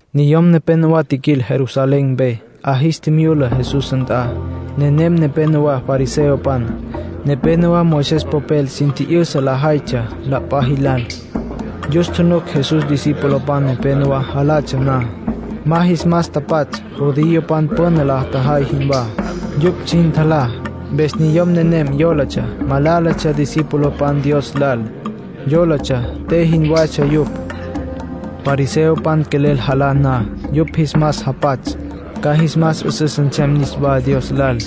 Niyom nepénowa tjiquil Jerusalén mpe, 'a jis tjimyula Jesús nt'a. Nenem nepénowa fariseopan, nepénowa Moisés popel sin tji'yüsa lajaytsja la p'a jilal. Yus tjunuc Jesús discipulopan nepenowá jalatsja na. Ma jis mas tapatsj, judiopan püna la tjajay jinwá. Yupj sin tjalá. Mpes niyom nenem yólatsja malálatsja discipulopan Dios lal. Yólatsja te jinwatsja yupj. (Fariseopan quelel jalá na, yupj jis mas japatsj, ca jis mas 'üsüs nsem niswá Dios lal.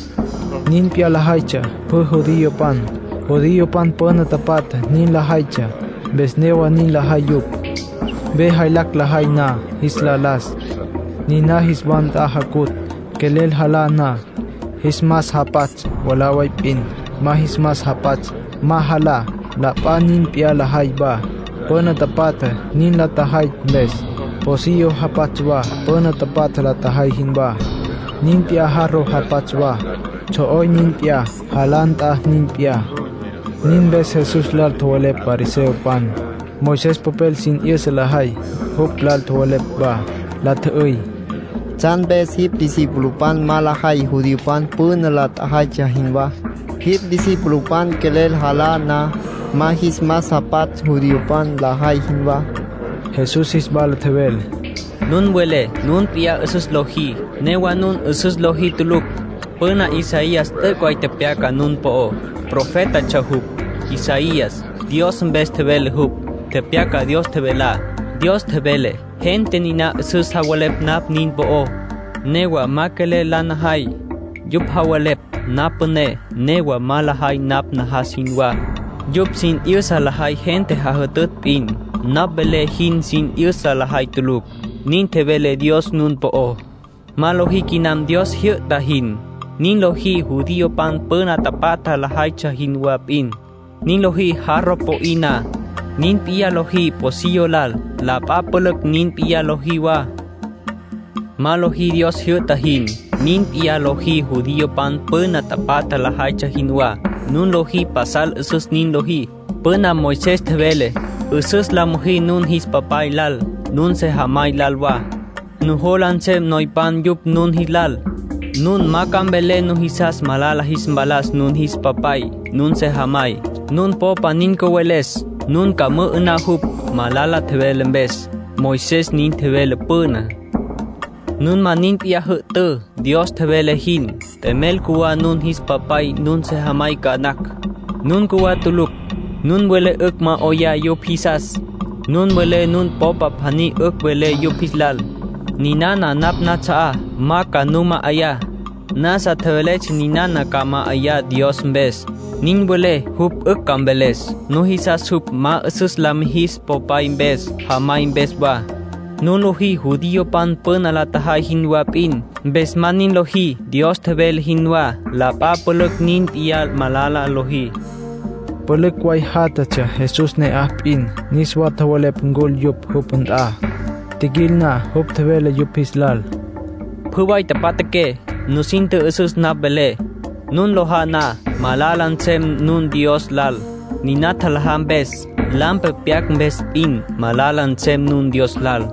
Nin p'iyá lajaytsja pjü judiopan. Judiopan püna tapatja nin lajaytsja, mpes newa nin lajay yupj. Ve jaylacj lajay na jis la las, niná jis wa nt'a jacutj. Quelel jalá na, jis mas japatsj mwalá way p'in. Ma jis mas japatsj, ma jalá. La p'a nin p'iyá lajay wa, püna tapatja nin la tjajay mpes. Pocillo japatsj wa püna tapatja la tjajay jinwá. Nin p'iyá jarro japatsj wa, tsjo'oy nin p'iyá, jalá nt'a nin p'iyá.) Nin mpes Jesús lal tjowelepj fariseopan, Moisés popel sin 'yüsa lajay jupj lal tjowelepj wa. La tjü'üy: —¿Tsjan mpes jipj discipulopan ma lajay judiopan püna la tjajaytsja jinwá? Jipj discipulopan quelel jalá na, ma jis mas japatsj judiopan lajay jinwá. Jesús jis wala tjevele: —Nun welé nun p'iyá 'üsüs lojí, newa nun 'üsüs lojí tulucj. Püna Isaías t'üc' way tepyaca nun po'ó. Profétatsja jupj, Isaías. Dios mpes tjevele jupj. Tepyaca Dios tjevelá. Dios tjevele: ‘Gente niná 'üsüs javelepj napj nin po'ó, newa ma quelel la najay. Yupj javelepj napj püné, newa ma lajay napj najas jinwá. Yupj sin 'yüsa lajay gente jajütütj p'in, napj velé jin sin 'yüsa lajay tulucj’, nin tjevele Dios nun po'ó. ”Ma lojí quinam Dios tjijyü'ta jin. Nin lojí judiopan püna tapatja lajaytsja jinwá p'in. Nin lojí jarro po'í na. Nin p'iyá lojí pocillo lal. La p'a pülücj nin p'iyá lojí wa. Ma lojí Dios tjijyü'ta jin. Nin p'in lojí judiopan püna tapatja lajaytsja jinwá. Nun nujola pasal 'üsüs nin lojí. Püna Moisés tjevele: ‘'Üsüs la müjí nun jis papay lal, nun sejamay lal wa. Nujola nsem noypan yupj nun jis lal. Nun ma ca mvelé nujisas malala jis mpalas nun jis papay, nun sejamay. Nun popa nin cüweles, nun ca mü'ü'ná jupj, malala tjevele mpes’, Moisés nin tjevele püná. Nun ma nin p'iyá jü'tǘ, Dios tjevele jin. T'emel cjuwá nun jis papay, nun sejamay ca nacj. Nun cjuwá tulucj. Nun welé 'ücj ma 'oyá yupj jisas. Nun welé nun popa pjaní 'ücj vele yupj jis lal: ‘Ninana napj nats'a'á ma ca nu ma'ayá. Nasa tjeveletsja ninana ca ma'ayá Dios mpes’, nin welé jupj 'ücj ca mveles. Nujisas jupj ma 'üsüs la mijis popay mpes, jamay mpes wa. Nun lojí judiopan püna la tjajay jinwá p'in. Mpes ma nin lojí Dios tjevele jinwá. La p'a pülücj nin p'iyá malala lojí —nin tjevele Jesús. Pülücj way játjatsja Jesús ne'aj p'in. Niswa tjevele ncul yupj jupj nt'a. Tjiquil na, jupj tjevele yupj jis lal: —Pjü way tjapja'aqué. Nusin tjü'üsüs napj velé. Nun lojá na, ma malala nsem nun Dios lal, niná tjalajá mpes. Lampe pyacj mpes p'in, malala nsem nun Dios lal.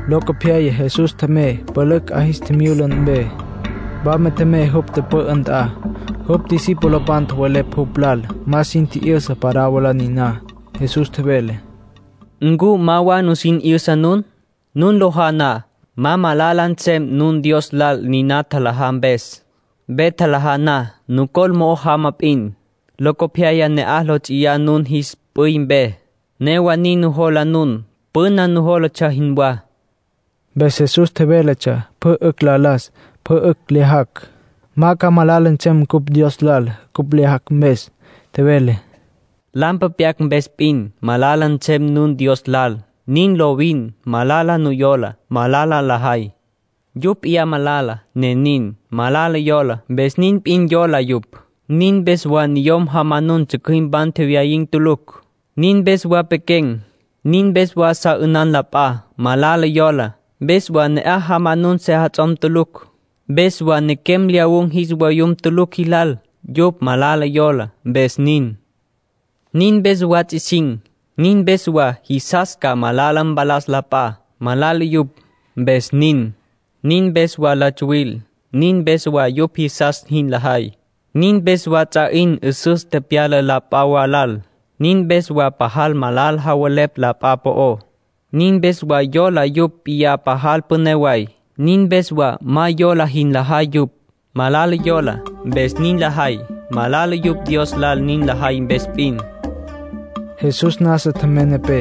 Locopyaya Jesús tjemey pülücj 'a jis tjimyula mpe. Wama tjemey jupj tüpü'ü nt'a. Jupj discipulopan tjowelepj jupj lal ma sin tji'yüsa parábola niná. Jesús tjevele: —¿Ncu ma wa nusin 'yüsa nun? Nun lojá na, ma malala nsem nun Dios lal niná tjalajá mpes. Ve tjalajá na, nucol mo'o jama p'in. Locopyaya na'aj lo ts'iyá nun jis p'üy mpe. Newa nin nujola nun, püna nujólatsja jinwá. (Mpes Jesús tjevéletsja pjü 'ücj la las, pjü 'ücj lyajacj. Ma ca malala nsem cupj Dios lal cupj lyajacj mpes.) Tjevele: —Lampe pyacj mpes p'in, malala nsem nun Dios lal. Nin lovin. Malala yola, malala lajay. Yupj p'iyá malala, ne nin. Malala yola, mpes nin p'in yola yupj. Nin mpes wa niyom jamanun tsjücjüimpan tjewyayin̈ tulucj. Nin mpes wa pequen̈. Nin mpes wa sa 'ünan la p'a. Malala yola, mpes wa ne'aj jamanun sejats'om tulucj. Mpes wa nequem lyawun̈ jis vayum tulucj jis lal. Yupj malala yola, mpes nin. Nin mpes wa ts'isin̈. Nin mpes wa jisas ca malala mpalas la p'a. Malala yupj, mpes nin. Nin mpes wa la tsuwil. Nin mpes wa yupj jisas jin lajay. Nin mpes wa ts'a 'in 'üsüs tepyala la p'a wa lal. Nin mpes wa pajal malala javelepj la p'a po'ó. Nin mpes wa yola yupj p'iyá pajal püné way. Nin mpes wa ma yola jin lajay yupj. Malala yola, mpes nin lajay. Malala yupj Dios lal nin lajay mpes p'in —nin tjevele Jesús. Jesús nasa tjemey nepé.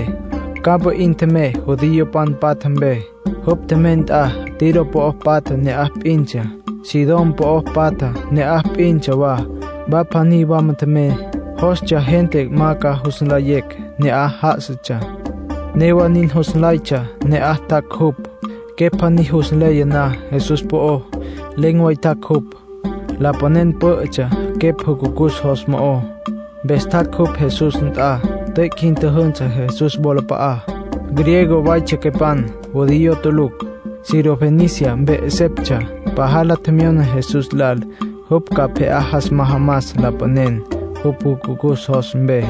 Campa 'in tjemey judiopan patja mpe. Jupj tjemey nt'a Tiro po'o patja ne'aj p'intsja, Sidón po'o patja ne'aj p'intsja wa. Wa pjaní wama tjemey. Jostsja gente ma ca jus nlayecj ne'aj já'asatsja. Newa nin, jus nlaytsja ne'aj tjac' jupj. Quepj pjaní jus nleya na Jesús po'ó, len̈ way tjac' jupj. Lapanen pǘ'ütsja quepj jucucus jos mo'ó. Mpes tjac' jupj Jesús nt'a, tüic' jin tjüjünsü Jesús wolap'a'á. Griego waytsja quepan, judío tulucj. Sirofenicia mpe 'eseptsja. Pajal la tjemyona Jesús lal jupj ca pje'á jas majamas lapanen jupj jucucus jos mpe.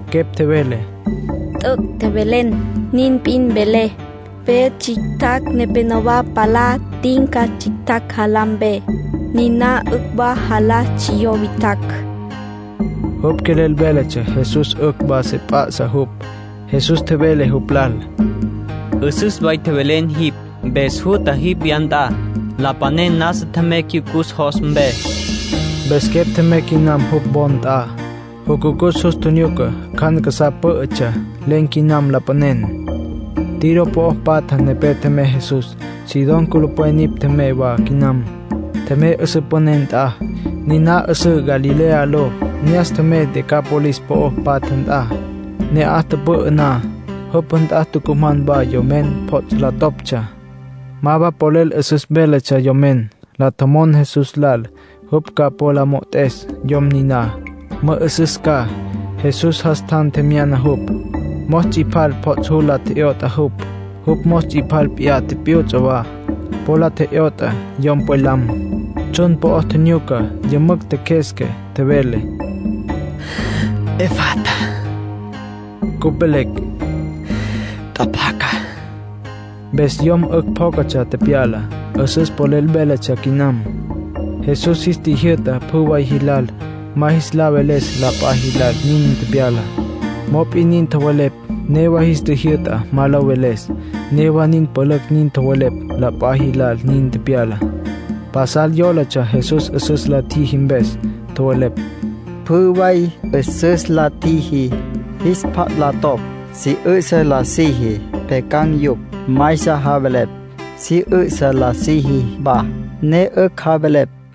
Quepj tjevele: —T'üc' tjevelen. Nin p'in velé, ve tsjictjacj nepenowá palá tinca tsjictjacj jalá mpe. Niná 'ücj wa jalá tsjiyó witjacj. (Jupj quelel véletsja Jesús 'ücj wa se p'a'sa jupj.) Jesús tjevele jupj lal: —'Üsüs way tjevelen jipj. Mpes jutja jipj wya nt'a. Lapanen nasa tjemey cyucus jos mpe. Mpes quepj tjemey quinam jupj wo nt'a. Jucucus jus tjinyuca cjan casá pǘ'ütsja. Len̈ quinam lapanen. Tiro po'o patja nepé tjemey Jesús. Sidón culupwen nipj tjemey wa quinam. Tjemey 'üsǘ püné nt'a, niná 'üsǘ Galilea ló. Ne'as tjemey Decápolis po'o patja nt'a. Ne'aj tüpü'ü na, jupj nt'a tucuman wa yomen pjots' la toptsja. Ma wa polel 'üsüs véletsja yomen. La tjomon Jesús lal jupj ca po la mo'ot'es yom niná, mü'ü'süs ca. Jesús jas tjan tjemyana jupj. Mos ts'ipal pjots' jul la tje'yot'a jupj. Jupj mos ts'ipal p'iyá tipyuts'a wa, po la tje'yot'a yom pwelam. Tsjun po'ó tjinyuca. Yümücj tjeqjuesca. Tjevele: “¡Efata!” (Cupj velecj: “Tjapjaca”.) Mpes yom 'ücj pjócatsja tepyala. 'Üsüs polel véletsja quinam. Jesús jis tjijyü'ta pjü way jilal ma jis la veles la p'a jilal nin tepyalá. Mop'in nin tjowelepj. Newa jis tjijyü'ta ma lo veles, newa nin la pülücj nin tjowelepj la p'a jilal nin tepyalá. Pasal yólatsja Jesús 'üsüs la tjiji mpes. Tjowelepj: “Pjü way 'üsüs la tjiji. Jis pjats' la topj, si 'ü'sa la siji, pjyacan̈ yupj. Maysa javelepj, si 'ü'sa la siji wa, ne 'ücj javelepj.”